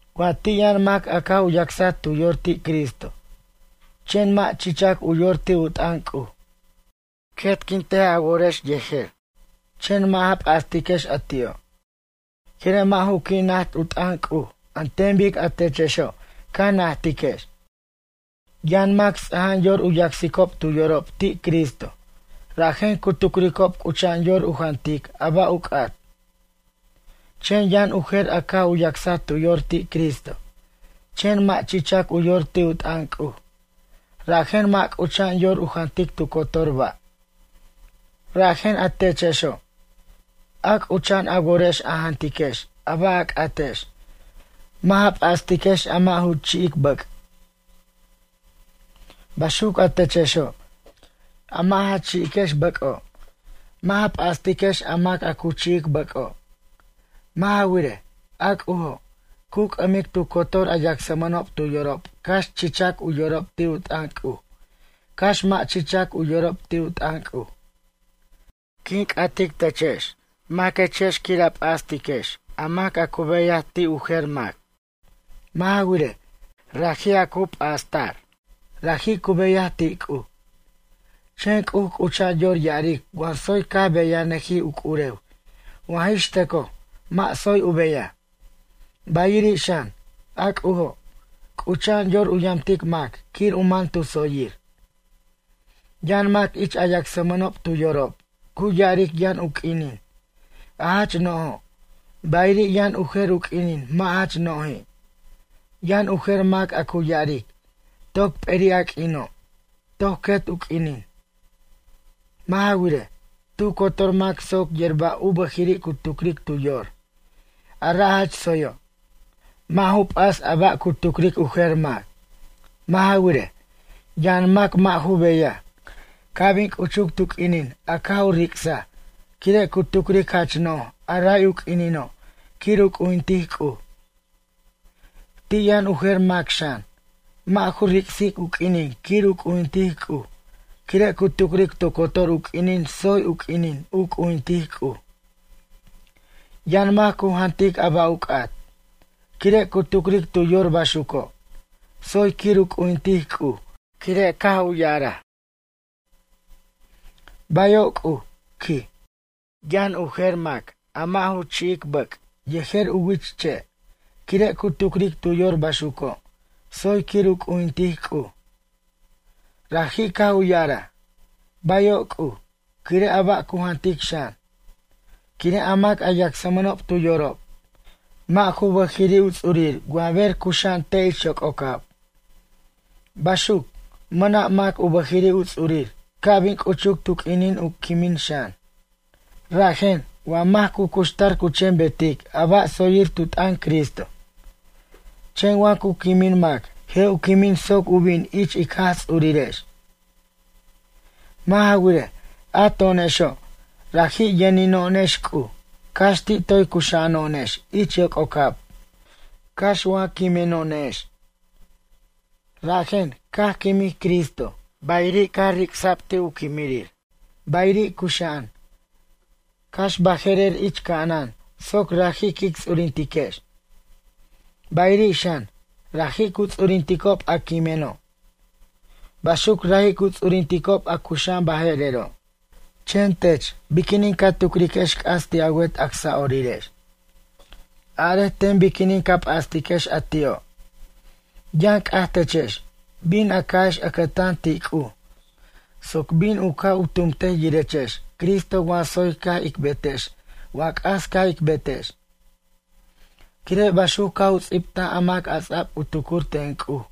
Wa ti' yʌn mac a caj u yacsaj tu yor ti' Cristo, chen mʌ' chichac u yor ti' u t'ʌn C'uj. Quetquintej a worex yejer, chen mʌ' ja p'astiquex a ti'o', quire' mʌ' ju qui' najt u t'ʌn C'uj an ten bic techexo' ca najtiquex. Yʌn mac ts'aja'an yor u yacsicob tu yorob ti' Cristo, rajen cu tucricob c'ucha'an yor u jantic a ba' u c'at. Chen yʌn u jer a caj u yacsaj tu yor ti' Cristo, chen mʌ' chichac u yor ti' u t'ʌn C'uj, rajen mʌ' c'ucha'an yor u jantic tu cotor ba'. Rajen, a techexo', a c'ucha'an a worex a jantiquex a ba' a c'atex, mʌ' ja p'astiquex a mʌ' ju chi'ic bʌc'. Baxuc a techexo', a mʌ' ja chi'iquex bʌc'o', mʌ' ja p'astiquex a mac a cu chi'ic bʌc'o'. Mʌ' ja wirej, a C'ujo', cu c'ʌmic tu cotor a yacsmʌnob tu yorob cax chichac u yorob ti' u t'ʌn C'uj, cax mʌ' chichac u yorob ti' u t'ʌn C'uj. Quin c'atic techex, maquechex quir a p'astiquex a mac a cu beyaj ti' u jer mac? Mʌ' ja wirej, raji' a cu p'asta'r, raji' cu beyaj ti' C'uj. Chen C'uj c'ucha'an yor ya'aric wa tsoy caj beyanʌjij u c'urew, wa jix tʌcoj mʌ' tsoy u beyaj. Bayiri' xan, a C'ujo', c'ucha'an yor u yamtic mac quir u man tu tsoyir. Yʌn mac ich a yacsmʌob tu yorob, cu ya'aric yʌn u q'uinin, a jach no'jo', bayiri' yʌn u jer u q'uinin mʌ' jach noji'. Yʌn u jer mac a cu ya'aric, toc p'eri' a q'uino', toc quet u q'uinin. Mʌ' ja wirej, tu cotor mac soc yer ba' u bʌjiri' cu tucric tu yor, a ra' jach tsoyo'. Mʌ' ju p'as a ba' cu tucric u jer mac. Mʌ' ja wirej, yʌn mac mʌ' ju beyaj, ca' bin c'uchuc tu q'uinin a caj u ric'saj, quire' cu tucric jach no'j a ray u q'uinino' quir u c'ujintic C'uj. Ti' yʌn u jer mac xan, mʌ' ju ric'sic u q'uinin quir u c'ujintic C'uj quire' cu tucric tu cotor u q'uinin tsoy u q'uinin u c'ujintic C'uj. Yʌn mac cu jantic a ba' u c'at, quire' cu tucric tu yor baxuco', tsoy quir u c'ujintic C'uj quire' caj ya'araj: “Bayo' C'uj”, quij. Yʌn u jer mac a mʌ' ju chi'ic bʌc' yejer u wich che', quire' cu tucric tu yor baxuco', tsoy quir u c'ujintic C'uj. Raji' caj u ya'araj: “Bayo' C'uj”, quire' a ba' cu jantic xan. Quire' a mac a yacsmʌnob tu yorob, mʌ' ju bʌjiri' u ts'urir wa ber cuxa'an te' ich yoc'ocab. Baxuc, mʌna' mac u bʌjiri' u ts'urir ca' bin c'uchuc tu q'uinin u quimin xan. Rajen, wa mac cu cuxtar cu chen betic a ba' tsoyir tu t'ʌn Cristo. Chen wa cu quimin mac, je' u quimin soc u bin ich ic Jaj Ts'urirex. Mʌ' ja wirej, a to'onexo', raji' yʌnino'onex C'uj, cax ti' toy cuxa'ano'onex ich yoc'ocab, cax wa quimeno'onex. Rajen, caj quimij Cristo, bayiri' caj ric'sa'b ti' u quimirir, bayiri' cuxa'an, cax baje'rer ich ca'anan soc raji' quic ts'urintiquex. Bayiri' xan, raji' cu ts'urinticob a quimeno'. Baxuc raji' cu ts'urinticob a cuxa'an baje'rero'. Chen tech biquinin ca tucriquex c'as ti' a wet acsa'orirex? Arej ten biquinin ca p'astiquex a ti'o'? Yʌn c'aj techex, bin a ca'ex ʌcʌtan ti' C'uj soc bin u ca' u tumtej yirechex Cristo wa tsoy caj ic betex wa c'as caj ic betex. Quire' baxuc caj u ts'ibta a mac a ts'a'b u tucur ten C'uj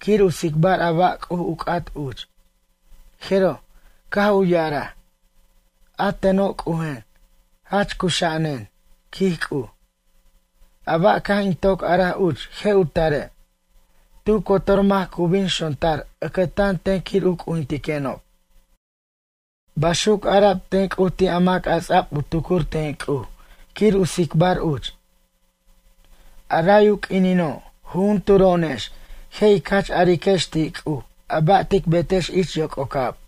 quir u tsicbar a ba' C'uj u c'at uch. Jeroj, caj u ya'araj: A teno' C'ujen, jach cuxa'anen, quij C'uj. A ba' caj in toc araj uch je' u tare'. Tu cotor mac cu bin xontar ʌcʌtan ten quir u c'ujintiquenob. Baxuc ara'b ten C'uj ti' a mac a ts'a'b u tucur ten C'uj quir u tsicbar uch. A ray u q'uinino', jujunturo'onex je' ic jach ariquex ti' C'uj a ba' tic betex ich yoc'ocab.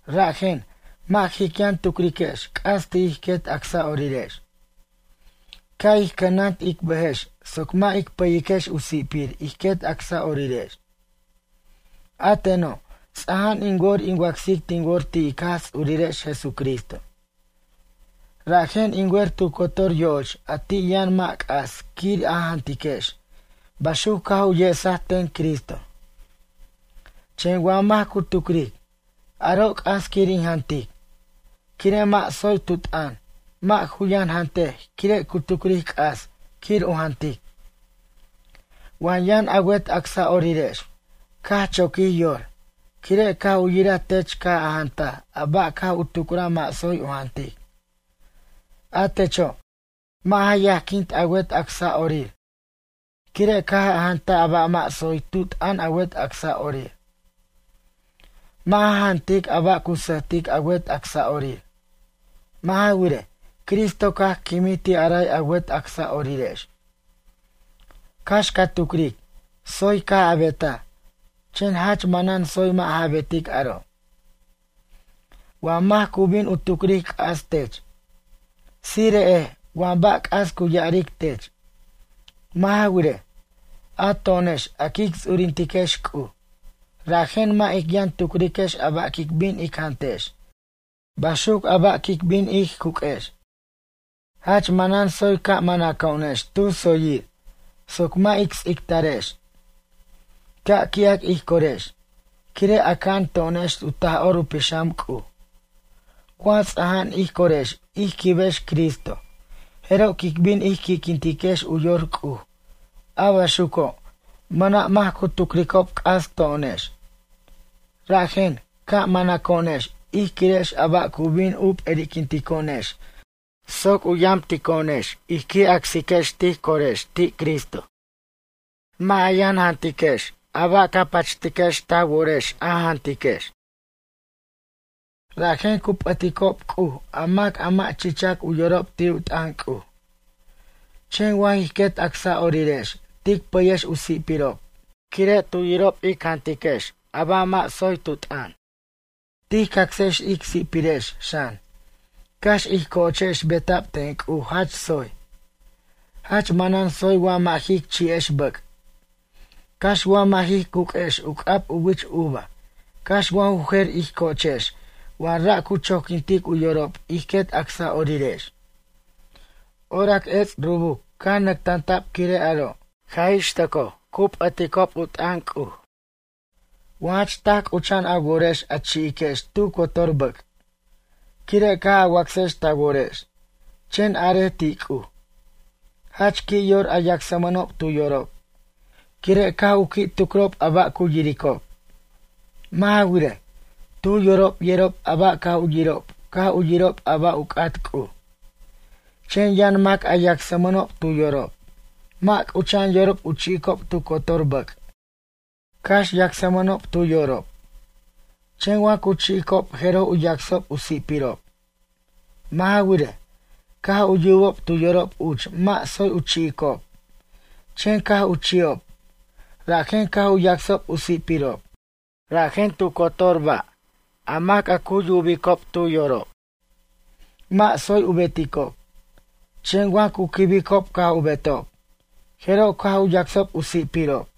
Rajen, mʌ' jic yʌn tucriquex c'as ti' ij quet acsa'orirex. Ca' ij cʌnant ic bʌjex soc mʌ' ic pʌyiquex u si'pir ij quet acasa'orirex. A teno', ts'aja'an in wor in wacsic tin wor ti' ic Jaj Ts'urirex Jesucristo. Rajen in wer tu cotor yo'och a ti' yʌn mʌ' c'as quir a jantiquex, baxuc caj u yesaten Cristo. Chen wa mac cu tucric: “Aro' c'as quir in jantic”, quire' mʌ' tsoy tu t'ʌn, mʌ' ju yʌn jantej quire' cu tucric c'as quir u jantic. Wa yʌn a wet acsa'orirex caj choquij yor, quire' caj u yiraj tech caj a jantaj a ba' caj u tucraj mʌ' tsoy u jantic. A techo', mʌ' ja yajquint a wet acsa'orir, quire' caj a jantaj a ba' mʌ' tsoy tu t'ʌn a wet acsa'orir. Mʌ' ja jantic a ba' cu sʌjtic a wet acsa'orir. Mʌ' ja wirej, Cristo caj quimij ti' a ray a wet acsa'orirex. Cax ca tucric, tsoy caj a betaj, chen jach manan tsoy mʌ' ja betic aro', wa mac cu bin u tucric c'as tech. Tsire'ej wa ba' c'as cu ya'aric tech. Mʌ' ja wirej, a to'onex a quic ts'urintiquex C'uj, rajen mʌ' ic yʌn tucriquex a ba' quic bin ic jantex, baxuc a ba' quic bin ij cuq'uex. Jach manan tsoy ca' manaco'onex tu tsoyir, soc mʌ' ic ts'ictarex. Ca' qui'ac ij corex, quire' aca'an to'onex u Taj'or u Pixam C'uj. Wa ts'aja'an ij corex ij quibex Cristo, jeroj quic bin ij qui'quintiquex u yor C'uj, a baxuco', mʌna' mac cu tucricob c'as to'onex. Rajen, ca' manʌco'onex ij quirex a ba' cu bin u p'eri'quinto'onex soc u yamtico'onex ij qui' acsiquex tij corex ti' Cristo. Mʌ' ja yʌn jantiquex a ba' ca pachtiquex ta worex a jantiquex. Rajen cu p'ʌticob C'uj, a mac a mʌ' chichac u yorob ti' u t'ʌn C'uj. Chen wa jij quet acsa'orirex tic pʌyex u si'pirob, quire' tu yirob ic jantiquex a ba' mʌ' tsoy tu t'ʌn. Tij cacsex ic si'pirex xan, cax ij co'ochex beta'b ten C'uj jach tsoy. Jach manan tsoy wa mʌ' jic chi'ex bʌc', cax wa mʌ' jij cuq'uex u c'ab u wich uva, cax wa ju jer ij co'ochex wa ra' cu choquintic u yorob ij quet acsa'orirex. Orac ets' rubuc caj nʌctanta'b quire' aro', jaj ix tʌcoj cu p'ʌticob u t'ʌn C'uj. Wa jach taj c'ucha'an a worex a chi'iquex tu cotor bʌc', quire' caj a wacsex ta worex, chen arej ti' C'uj. Jach qui' yor a yacsmʌnob tu yorob, quire' caj u qui' tucrob a ba' cu yiricob. Mʌ' ja wirej, tu yorob yerob a ba' caj u yirob caj u yirob a ba' u c'at C'uj. Chen yʌn mac a yacsmʌnob tu yorob, mʌ' c'ucha'an yorob u chi'ob tu cotor bʌc', cax yacsmʌnob tu yorob. Chen wa cu chi'icob jeroj u yacsob u si'pirob. Mʌ' ja wirej, caj u yubob tu yorob uch mʌ' tsoy u chi'icob, chen caj u chi'ob, rajen caj u yacsob u si'pirob. Rajen, tu cotor ba' a mac a cu yubicob tu yorob, mʌ' tsoy u beticob, chen wa cu quibicob caj u betob, jeroj caj u yacsob u si'pirob.